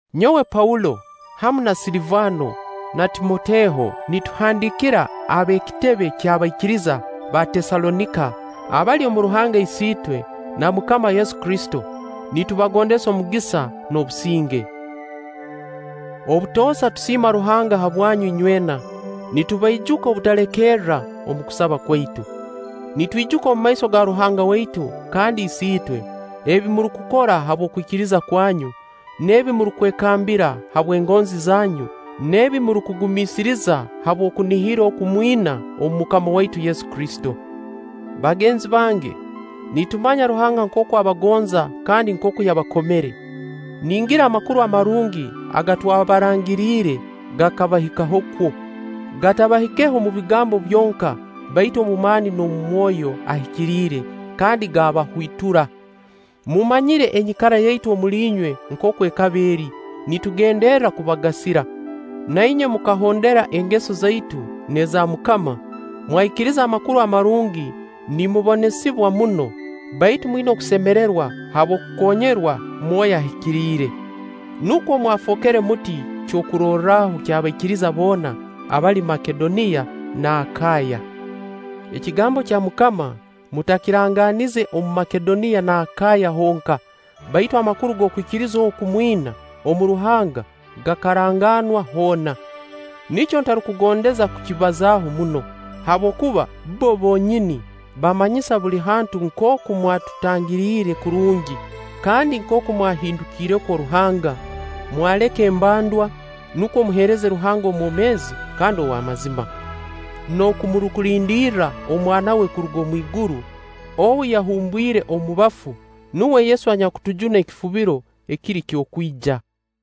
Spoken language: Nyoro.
Nyowe Paulo, hamu na Silivaano na Timoteho, nituhandiikira ab'ekitebe ky'abaikiriza ba Teesalonika abali omu Ruhanga Isiitwe na MUKAMA Yesu Kristo: Nitubagondeza omugisa n'obusinge. Obutoosa tusiima Ruhanga habwanyu inywena, nitubaijuka obutalekerra omu kusaba kwaitu. Nitwijuka omumaiso ga Ruhanga waitu kandi Isiitwe ebi murukukora habw'okwikiriza kwanyu, n'ebi murukwekambira habw'engonzi zanyu, n'ebi murukugumiisiriza habw'okunihira oku mwina omu MUKAMA waitu Yesu Kristo. Bagenzi bange, nitumanya Ruhanga nkooku abagonza kandi nkooku yabakomere; ningira Amakuru Amarungi aga twabarangiriire gakabahikaho kwo. Gatabahikeho omu bigambo byonka, baitu omu maani n'omu Mwoyo Ahikiriire kandi gakabahwitura. Mumanyire enyikara yaitu omuli inywe nkooku ekaba eri nitugenderra kubagasira. Na inywe mukahondera engeso zaitu n'eza MUKAMA, mwaikiriza Amakuru Amarungi nimubonesibwa muno, baitu mwina okusemererwa habw'okukoonyerwa Mwoyo Ahikiriire. Nukwo mwafookere muti kyokurorraho ky'abaikiriza boona abali Makedoniya n'Akaaya. Ekigambo kya MUKAMA mutakirangaanize omu Makedoniya n'Akaaya honka, baitu amakuru g'okwikiriza oku mwina omu Ruhanga gakaranganwa hoona. Nikyo ntarukugondeza kukibazaaho muno; habwokuba bbo bonyini bamanyisa buli hantu nkooku mwatutangiriire kurungi kandi nkooku mwahindukiire kwo Ruhanga, mwaleka embandwa, nukwo muheereze Ruhanga omwomeezi kandi ow'amazima, n'oku murukulindirirra Omwana we kuruga omu iguru, ou yahumbwire omu bafu, nuwe Yesu anyakutujuna ekifubiro ekiri ky'okwija.